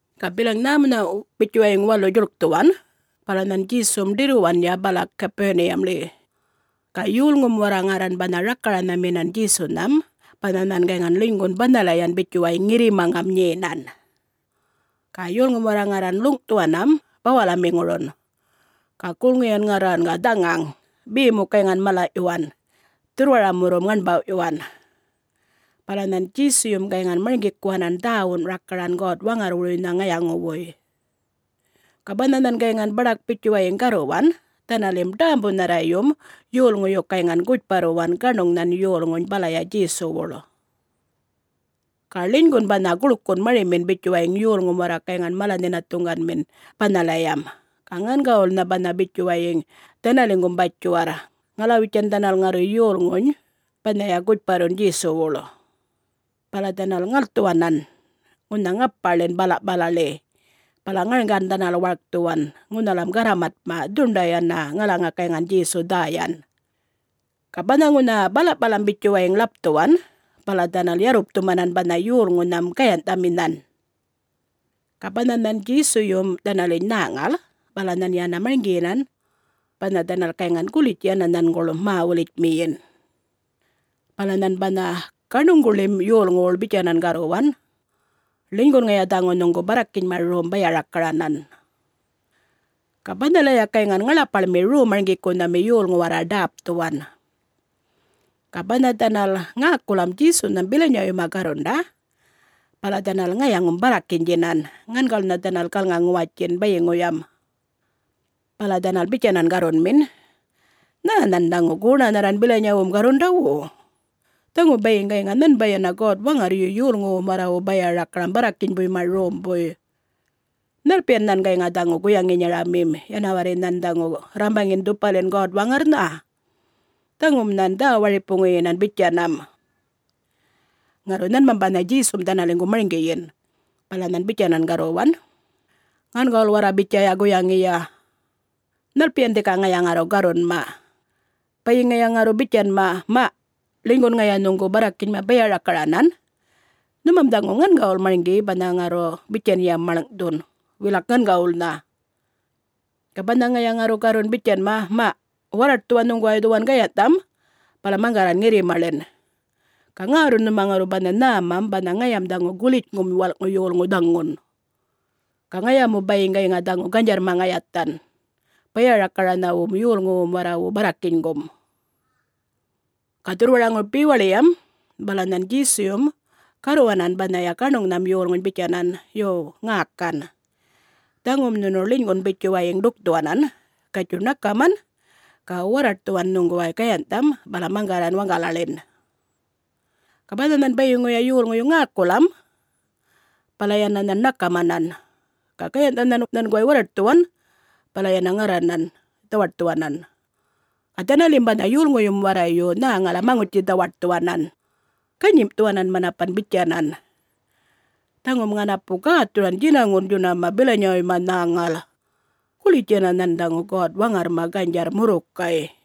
Ga bilaŋ nhämunhaꞌ bitjuwayiŋ walu djuḻkthuwan, bala nhan Djesum ḏirruwanya bala Gapuniyamḻi. Ga yolŋum warra ŋarran banha rakaranhaminan Djesunham banha nhan gayŋan ḻinygun banhalayan bitjuwayiŋ ŋirrimaŋam nyenan. Ga yolŋum warra ŋarran ḻuŋꞌthuwanam bawalamiŋurun. Ga gulŋiyan ŋarran ga dhaŋaŋ, be mu gayŋan malaꞌyuwan, dhurrwaramurrum ŋaṉbawꞌyuwan. Bala nhan Djesuyum gayŋan marŋgikuwanan dhäwun rakaran God-Waŋarrwuruynha ŋayaŋuwuy. Ga banha nhan gayŋan baḏak bitjuwayiŋ garruwan, dhanalim ḏämbunharrayum yolŋuyu gayŋan gutjparruwan gaṉuŋnhan yolŋuny balaya Djesuwuḻ. Ga ḻinygun banha guḻkun marimin bitjuwayiŋ yolŋum warra gayŋan mala-nhinathuŋganmin banhalayam, ga ŋangawulnha banha bitjuwayiŋ dhanaliŋgum batjiwarr ŋalawitjan dhanal ŋarru yolŋuny banhaya gutjparrun Djesuwuḻ. Bala dhanal ŋalthuwanan ŋunha ŋapaḻin balaꞌpalaḻi bala ŋarŋgan dhanal warkthuwan ŋunhalam garramatꞌma dhuṉḏay yana ŋalaŋa gayŋan Djesu dhäyan. Ga banha ŋunha balaꞌpalam bitjuwayiŋ ḻapthuwan bala dhanal yarrupthumanan banha yolŋunham gayanhꞌthaminhan. Ga banha nhan Djesuyum dhanaliny nhäŋal bala nhan yana marŋgiyinan banha dhanal gayŋan gulitj yana nhanguḻ mä-wulitjmiyin. Bala nhan banha gaṉuŋguḻim yolŋuwuḻ bitjanan garruwan, “Ḻinygun ŋaya dhaŋu nhuŋgu barrakinyma rom baya-rakaranan.” Ga banhalaya gayŋan ŋaḻapaḻmi Rom-marŋgikunhami yolŋu warra ḏäpthuwan. Ga banha dhanal ŋäkulam Djesunham bilanyawuyma garrunda bala dhanal ŋayaŋum barrakinydjinan, ŋangawulnha dhanal galŋa-ŋuwatjin bayiŋuyam. Bala dhanal bitjanan garrunmin, “Nhä nhan dhaŋu goṉanharran bilanyawum garrundawu. Dhaŋu bayiŋ gayŋa nhanbay yana God-Waŋarryu yolŋuwum warrawu baya-rakaram barrakinybuyma rombuy. Nhalpiyan nhan gayŋa dhaŋu guyaŋinyaramim, yana warri nhan dhaŋu rrambaŋin dhupalin God-Waŋarrnha? Dhaŋum nhan dhä-waripuŋuyinan bitjanam!” Ŋarru nhanmam banha Djesum dhanaliŋgu marŋgiyin, bala nhan bitjanan garruwan, “Ŋangawul warra bitjaya guyaŋiya! Nhalpiyan dhika ŋaya ŋarru garrunma? Bayiŋ ŋaya ŋarru bitjanma, ‘Maꞌ, ḻinygun ŋaya nhuŋgu barrakinyma baya-rakaranan’, nhumam dhaŋu ŋangawul marŋgi banha ŋarru bitjanyam maḻŋꞌthun, wilak ŋangawulnha. Ga banha ŋaya ŋarru garrun bitjanma, ‘Maꞌ warraṯthuwan nhuŋguway dhuwan gayanhꞌtham bala maŋgarran ŋirrimaḻin’, ga ŋärrun nhuma ŋarru banha nhämam banha ŋayam dhaŋu Gulitjŋum walꞌŋu Yolŋu dhaŋun. Ga ŋaya mu gayŋa dhaŋu ganydjarrma ŋayathan baya-rakaranhawum yolŋuwum warrawu barrakinygum.” Ga dhurrwaraŋuru bewaḻiyam bala nhan Djesuyum garruwanan banhaya gaṉuŋnham yolŋuny bitjanan, “Yo, ŋäkan! Dhaŋum nhunu ḻinygun bitjuwayiŋ ḏukthuwanan, gatjuy, ṉakaman ga warraṯthuwan nhuŋguway gayanhꞌtham bala maŋgarran waŋgalaḻin.” Ga banha nhan bayiŋuya yolŋuyu ŋäkulam, bala yana nhan ṉakamanan. Ga gayanhꞌtha nhan nhanguway warraṯthuwan bala yana ŋarranan dhawaṯthuwanan. Ga dhanalim banha yolŋuyum warrayu nhäŋalam maŋutji-dhawaṯthuwanan, ganyimꞌthuwanan manapan bitjanan, “Dhaŋum ŋanapu gäthuran djinaŋun djunama bilanyawuyma nhäŋal. Gulitj yana nhan dhaŋu God-Waŋarrma ganydjarr murrukay.”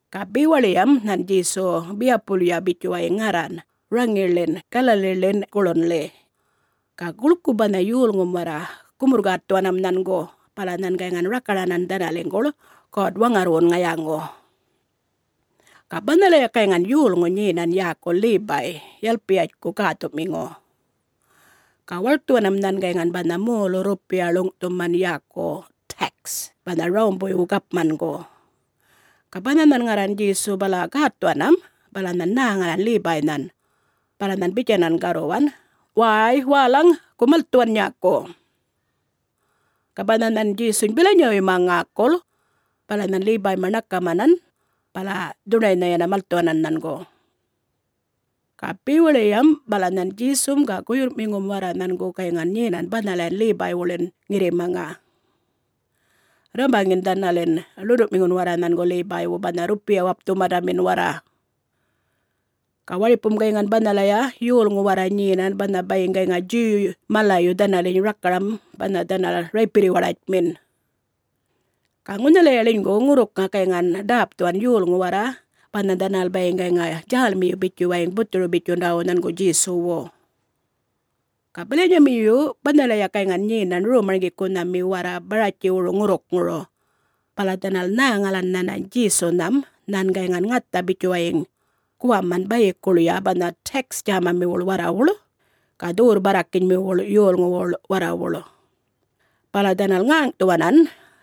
Ga bewaḻiyam nhan Djesu biyapulya bitjuwayiŋ ŋarran raŋiḻin Galaliḻin guḻunꞌḻi. Ga guḻku banha yolŋum warra gumurr-gätthuwanam nhangu bala nhan gayŋan rakaranan dhanaliŋguḻ God-Waŋarrwun ŋayaŋu. Ga banhalaya gayŋan yolŋu nyenan yäku Lebay, Yalpiyatjku gäthu'miŋu. Ga warkthuwanam nhan gayŋan banha molu-rrupiya ḻuŋ'thuman yäku tax banha Rawumbuywu gapmangu. Ga banha nhan ŋarran Djesu bala gätthuwanam, bala nhan nhäŋalan Lebaynhan. Bala nhan bitjanan garruwan, “Wäy wälaŋ, gu malthuwan nyäku!” Ga banha nhan Djesuny bilanyawuyma ŋäkul, bala nhan Lebayma ṉakamanam bala dhuṉḏaynha yana malthuwanan nhangu. Ga bewaḻiyam bala nhan Djesum ga guyurrꞌmiŋum warra nhangu gayŋan nyenan banhalayan Lebaywuḻim ŋirrimaŋa, rrambaŋin dhanalin ḻunduꞌmiŋun warra nhangu Lebaywu banha rrupiya-wapthumandamin warra. Ga waripum gayŋan banhalaya yolŋu warra nyenan banha bayiŋ gayŋa Djuw malayu dhanaliny rakaram banha dhanal raypirri-waḏatjmin. Ga ŋunhalaya ḻinygu ŋurrukŋa gayŋan ḏäpthuwan yolŋu warra banha dhanal bayiŋ gayŋa djälmiyi bitjuwayiŋ buthuru-bitjundawu nhangu Djesuwu. Ga bilanyamiyu banhalaya gayŋan nyenan rom-marŋgikunhami warra Baratjiwuru ŋurrukŋuru. Bala dhanal nhäŋalan nhanany Djesunham nhan gayŋan ŋatha bitjuwayiŋ guwaman bayikuḻya banha tax djämamiwuḻ warrawuḻ ga dhuwurr-barrakinymiwuḻ yolŋuwuḻ warrawuḻ. Bala dhanal ŋäŋꞌthuwanan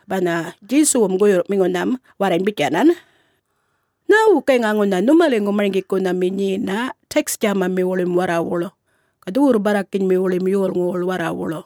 banha guyurrꞌmiŋunham warrany bitjanan, “Nhäwu gayŋa ŋunha nhumaliŋgum marŋgikunhami nyena tax djämamiwuḻim warrawuḻ ga dhuwurr-barrakinymiwuḻim yolŋuwuḻ warrawuḻ?”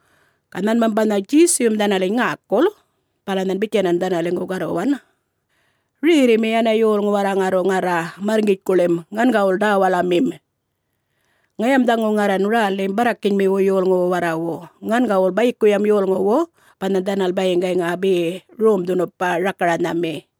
Ga nhanmam banha Djesuyum dhanaliny ŋäkul, bala nhan bitjanan dhanaliŋgu garruwan, “Rerrimi yana yolŋu warra ŋarru ŋarra marrŋgitjkuḻim, ŋangawul ḏäwalamim. Ŋayam dhaŋu ŋarran rälim barrakinymiwu yolŋuwu warrawu, ŋangawul bayikuyam yolŋuwu banha dhanal bayiŋ gayŋa be rom-dhunupa rakaranhamim.”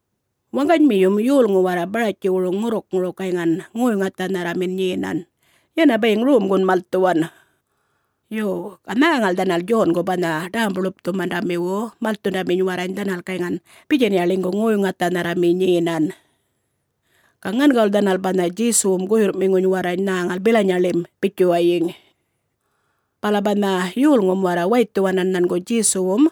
Waŋganymiyum, yolŋu warra Baratjiwuru ŋurrukŋuru gayŋan ŋoy-ŋathanharramin nyenan yana bayiŋ romgun malthuwan. Yo, ga nhäŋal dhanal Djongu banha Ḏämbu-Ḻupthumandamiwu malthundaminy warrany dhanal gayŋan bitjanya ḻinygu ŋoy-ŋathanharrami nyenan. Ga ŋangawul dhanal banha Djesuwum guyurrꞌmiŋuny warrany nhäŋal bilanyaḻim bitjuwayiŋ. Bala banha yolŋum warra waythuwanan nhangu Djesuwum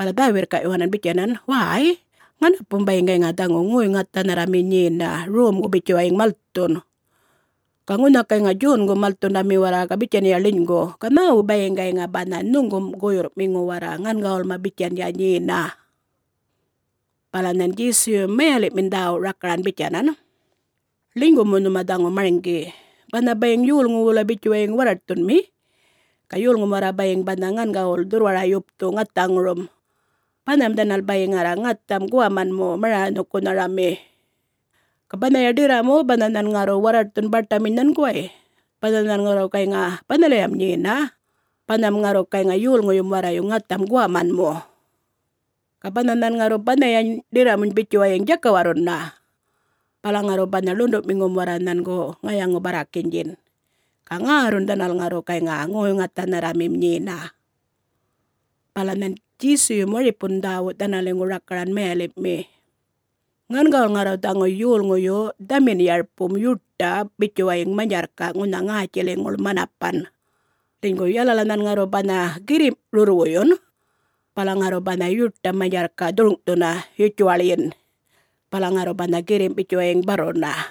bala dhä-wirrkaꞌyuwanan bitjanan, “Wäy, ŋanapum bayiŋ gayŋa dhaŋu ŋoy-ŋathanharrami nyena, romgu bitjuwayiŋ malthun. Ga ŋunha gayŋa Djongum malthundami warra bitjanya ḻinygu. Ga nhäwu bayiŋ gayŋa banha nhuŋgum guyurrꞌmiŋu warra ŋangawulma bitjanya nyena?” Bala nhan Djesuyum mayaḻiꞌmin dhäwu rakaran bitjanan, “Ḻinygu mu nhuma dhaŋu marŋgi: Banha bayiŋ yolŋu wulay bitjuwayiŋ warraṯthunmi, ga yolŋum warra bayiŋ banha ŋangawul dhurrwara-yupthu ŋathaŋurum, banham dhanal bayiŋ ŋarra ŋatham guwaman mu maranhukunharami. Ga banhaya ḏirramu banha nhan ŋarru warraṯthun baṯaminy nhanguway, banha nhan ŋarru gayŋa banhalayam nyena, banham ŋarru gayŋa yolŋuyum warrayu ŋatham guwaman mu. Ga banha nhan ŋarru banhayany ḏirramuny bitjuwayiŋ djakawarruna, bala ŋarru banha ḻunduꞌmiŋum warra nhangu ŋayaŋu-barrakinydjin ga ŋärrun dhanal ŋarru gayŋa ŋoy-ŋathanharramim nyena.” Bala nhan Djesuyum waripun dhäwu dhanaliŋgu rakaran mayaliꞌmi, “Ŋangawul ŋarru dhaŋu yolŋuyu dhamin-yarpum yuṯa bitjuwayiŋ manydjarrkaꞌ ŋunha ŋätjiliŋuḻ manapan. Ḻinygu yalala nhan ŋarru banha girrimꞌ rurrwuyun, bala ŋarru banha yuṯam manydjarrkaꞌ dhurŋꞌthuna yutjuwaḻyin, bala ŋarru banha girrimꞌ bitjuwayiŋ barruna.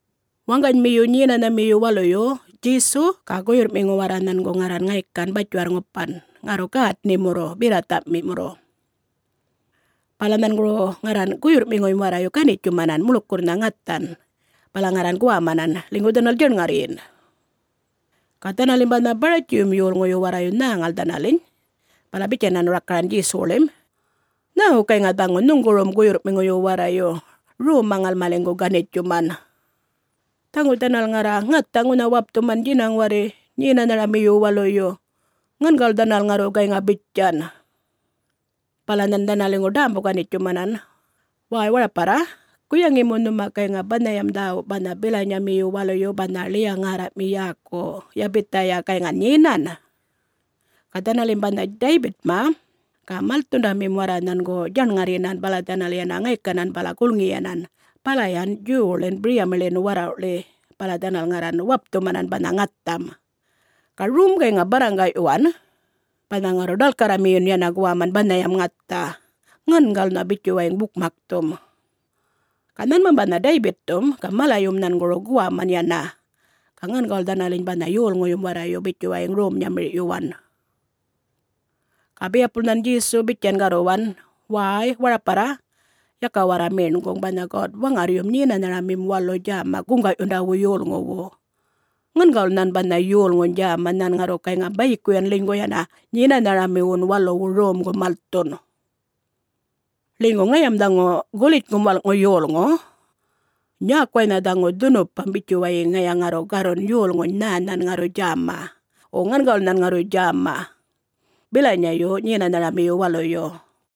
Waŋganymiyu Nyenanharamiyu Waluyu Djesu ga guyurrꞌmiŋu warra nhangu ŋarran ŋaykan batjiwarr-ŋupan, ŋarru gätnimurru berrathamimurru. Bala nhanguru ŋarran guyurrꞌmiŋuyum warrayu ganitjumanan muḻkurrnha ŋathan bala ŋarran guwamanan, ḻinygu dhanal djaṉŋarryin. Ga dhanalim banha Baratjiyum yolŋuyu warrayu nhäŋal dhanaliny, bala bitjanan rakaran Djesuwuḻim, “Nhäwu gayŋa dhaŋu nhuŋgurum guyurrꞌmiŋuyu warrayu romma ŋalmaliŋgu ganitjuman? Dhaŋu dhanal ŋarra ŋatha ŋunha wapthuman djinaŋ warri Nyenanharamiyun Waluyu. Ŋangawul dhanal ŋarru gayŋa bitjan!” Bala nhan dhanaliŋgu ḏämbu-wanitjumanan, “Wäy, waraparra, guyaŋi mu nhuma gayŋa banhayam dhäwu banha bilinyamiyu waluyu banha Ḻiya-ŋärraꞌmi yäku Yabithaya gayŋan nyenan? Ga dhanalim banha Daybitma ga malthundamim warra nhangu djaṉŋarryinan bala dhanal yana ŋaykanan bala gulŋiyanan balayan Djuwwuḻin biryamiḻin warrawꞌḻi bala dhanal ŋarran wapthumanan banha ŋatham. Ga rom gayŋan barraŋgaꞌyuwan banha ŋarru ḏalkarramiyun yana guwaman banhayam ŋatha, ŋangawulnha bitjuwayiŋ bukmakthum. Ga nhanmam banha Daybitthum ga malayum nhanguru guwaman yana ga ŋangawul dhanaliny banha yolŋuyum warrayu bitjuwayiŋ rom-nyamirꞌyuwan.” Ga biyapul nhan Djesu bitjan garruwan, “Wäy waraparra, yaka warra meṉguŋ, banha God-Waŋarryum Nyenanharamim Walu djäma guŋgaꞌyundawu yolŋuwu. Ŋangawul nhan banha yolŋuny djäma nhan ŋarru gayŋa bayikuyan ḻinygu yana Nyenanharamiwun Waluwu romgu malthun. Ḻinygu ŋayam dhaŋu Gulitjŋum Walꞌŋu Yolŋu, nyäkuwaynha dhaŋu dhunupam bitjuwayiŋ ŋaya ŋarru garrun yolŋuny nhä nhan ŋarru djäma, wo ŋangawul nhan ŋarru djäma bilanyayu Nyenanharamiyu Waluyu.”